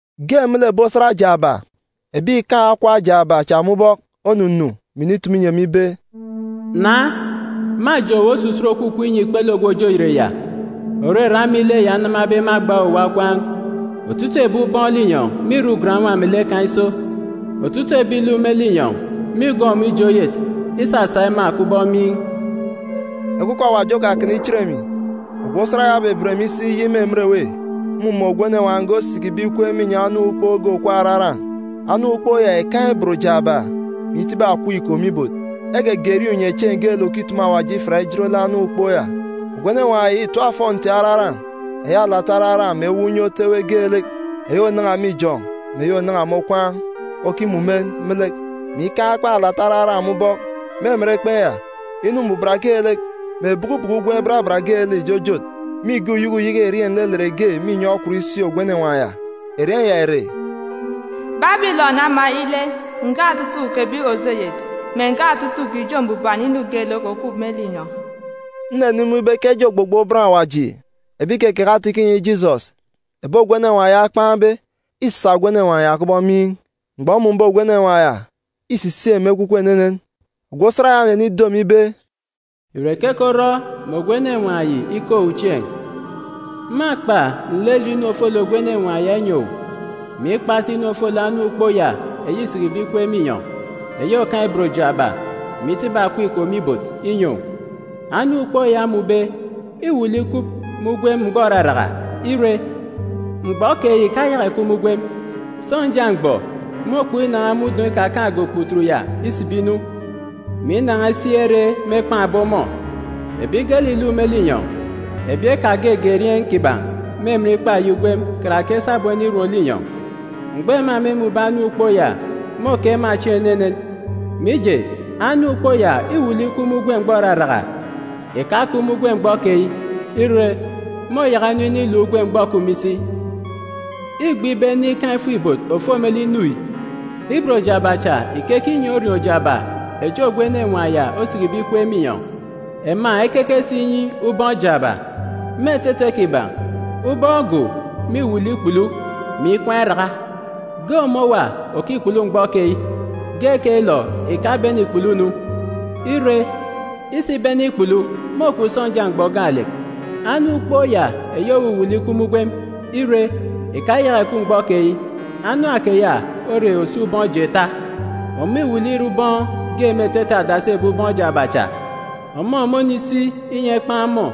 Ge me lek ebi osat jaaba, ebi ìkaan̄ okwa jaaba cha me ubọk onunu, mè initumu inyi emi ibe, “Na, mâjeen̄ owu osusut òkukup inyi ikpele ogwu òje oyet ya, òrere ama ile ya enamabe me agba owuwa okwaan̄. Otutuuk ebi ubọọn̄ linyọn̄ mîrọ ugan-nwa melek kan̄ iso. Otutuuk ebi ìluk me linyọn̄ mîgọọk ọmọ ije oyet, isasa ema kubọk miin̄.” Ekwukwu Awaji okakana ichit emi. Ogwu osat ya obeben emi isi iyik me emen èwê. Mmumun̄ ogwu enenwaan̄ ge osikibe ikweek irek me inyọn̄ anam ukpook ge òkup araran̄. Anam ukpook ya ìkaan̄ ibot jaaba, mè itibi akọp iko me ibot. Egege erieen̄ unyechieen̄ geelek òkitumu Awaji ifiat ijot lek anam ukpook ya. Ogwu enenwaan̄ ya ìtap ofọnti araran̄, eyi alata araran̄ mè ewuuk unye otu ewe geelek, eyi ònan̄a me ijọn̄ mè eyi ònan̄a me okwaan̄, okimumen me lek, mè ikaan̄ ekpen̄ alata araran̄ me ubọk. Me emen ekpen̄ ya, mbuban inu geelek, mè bukubuku ugwem barabat geelek ìjojot. Mîge uyeke uyeke erieen̄ nlelet ge me inyọn̄ okwut isi ogwu enenwaan̄ ya. Erieen̄ ya ìre, BABILỌN AMA ILE, NGA OTUTUUK EBI ÒJE OYET, MÈ NGA OTUTUUK IJO MBUBAN INU GEELEK ÒKUP ME LINYỌN̄. Nnenimun̄ ibe ke eje ogbogbo bọn Awaji, ebi ìkekeke ata-ikọ inyi Jisọs, ebi ogwu enenwaan̄ ya okpan̄be, îsa ogwu enenwaan̄ ya kubọk miin̄. Mgbọ mmun̄be ogwu enenwaan̄ ya, îsisik emi ekwukwu enenen. Ogwu osat ya onenido emi ibe, “Ìre keke orọ mè ogwu enenwaan̄ yi ike owu chieen̄? Mâkpa nlelet inu ofolek ogwu enenwaan̄ ya inyi owu, mè ikpa si inu ofolek anam ukpook ya eyi îsikibe ikweek me inyọn̄, eyi òkaan̄ ibot jaaba, mè itibi akọp iko me ibot, inyi owu. Anam ukpook ya omun̄be îwuuk lek ikup me ugwem mgbọ òraraka, ire, mgbọ keyi ìkayaka ìkup me ugwem. Sọnja mgbọ, môkpọk inan̄a me udọn̄ ikakaan̄ge okputut ya isibi inu, mè inan̄a isi ere mêkpan̄be ọmọ. Ebi geelek ìluk me linyọn̄, ebi ekagege erieen̄ kiban̄ me emen ikpa eyi ugwem karake sabum enirom linyọn̄, mgbọ ema mêmun̄be anam ukpook ya, môke ema chieen̄ enenen. Mije, anam ukpook ya îwuuk lek ikup me ugwem mgbọ òraraka, ìkakup me ugwem mgbọ keyi, ire, môyaka inu iniluk ugwem mgbọ òkup me isi. “Îgbe ibe ene ikaan̄ ifuk-ibot òfo me lek inu yi. Ibot jaaba cha ìkeke inyi orioon̄ jaaba echi ogwu enenwaan̄ ya osikibe ikweek me inyọn̄. Ema ekeke si inyi ubọọn̄ jaaba. Me etete kiban̄, ubọọn̄ go mîwuuk lek ikpulu, mè ikwaan̄ iraka. Ge ọmọ òwa òkikpulu mgbọ keyi. Ge keyilọ ìkabene ìkpulu nu. Ire, isibene ikpulu, môkup sọnja mgbọ gaalek. Anam ukpook ya eyi òwuwuuk lek ikup me ugwem, ire, ìkayaka ìkup mgbọ keyi, anam keya ore òso ubọọn̄ jeeta. Ọmọ îwuuk lek ìre ubọọn̄ ge me etete adasi ebi ubọọn̄ jaaba cha. Ọmọ mônisi inyi ekpan̄ ọmọ.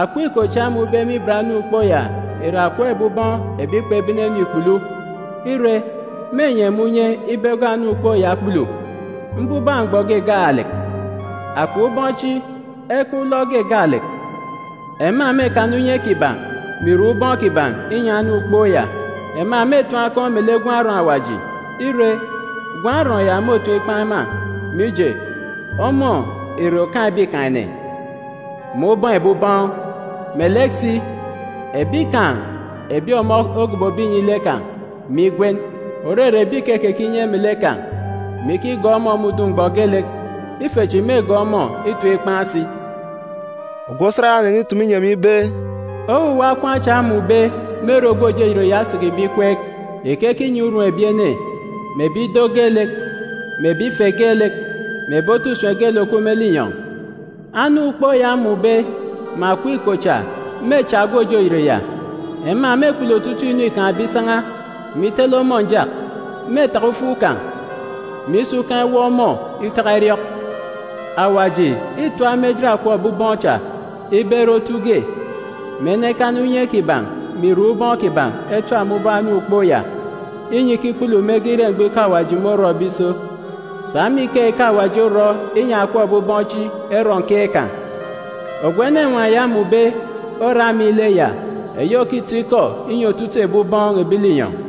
“Akọp iko cha omun̄be me ibot anam ukpook ya ìre akọp ebi ubọọn̄ ebi kpebene-nu ikpulu. Ire, mênyi ema unye ibe egọọk anam ukpook ya ekpulu, mbubak mgbọ ge gaalek. Akọp ubọọn̄ chi ekaan̄ ulọk ge gaalek. Ema mêkana unye kiban̄, mè irek ubọọn̄ kiban̄ inyi anam ukpook ya. Ema mêtim akọn̄ me lek Gwun̄ Arọọn̄ Awaji. Ire, Gwun̄ Arọọn̄ ya môtim ikpan̄ ema, mije, ọmọ ìre Okaan̄ ebikaan̄-ene, mè Ubọọn̄ ebi ubọọn̄. Melek si, ebi kan̄ ebi ọmọ ogobobe inyi lek kan̄, mè igwen, òrere ebi ìkekeke inye melek kan̄, mè ikigọọk ọmọ me udun̄ mgbọ geelek, ife chi mêgọọk ọmọ itim ikpan̄ si.” Ogwu osat ya onenitumu inyi emi ibe, “Owuwa okwaan̄ cha omun̄be me ere ogwu òje oyet ya osikibe ikweek ìkeke inyi urum ebi ene, mè ebi ido geelek, mè ebi ife geelek, mè ebi otu usem geelek òkup me linyọn̄. Anam ukpook ya omun̄be, mè akọp iko cha mêcha ogwu òje oyet ya. Ema mêkpulu otutuuk inu îkaan̄be isan̄a, me itele ọmọ njak. Mêtaka ufuk kan̄, mè isa ukan̄ iwọp ọmọ itaka iriọk. Awaji îtap me ejit akọp ebi ubọọn̄ cha ibe ere otu ge, mè enekana unye kiban̄ mè irek ubọọn̄ kiban̄ etap me ubọk anam ukpook ya, inyi ikikpulu mege ire mgbọ ikọ Awaji môrọbe iso. Sa me ikeyi ke Awaji orọ inyi akọp ebi ubọọn̄ chi erọ nkeek kan̄. Ogwu enenwaan̄ ya omun̄be ore ama ile ya, eyi òkitọ ikọ inyi otutuuk ebi ubọọn̄ ebi linyọn̄.”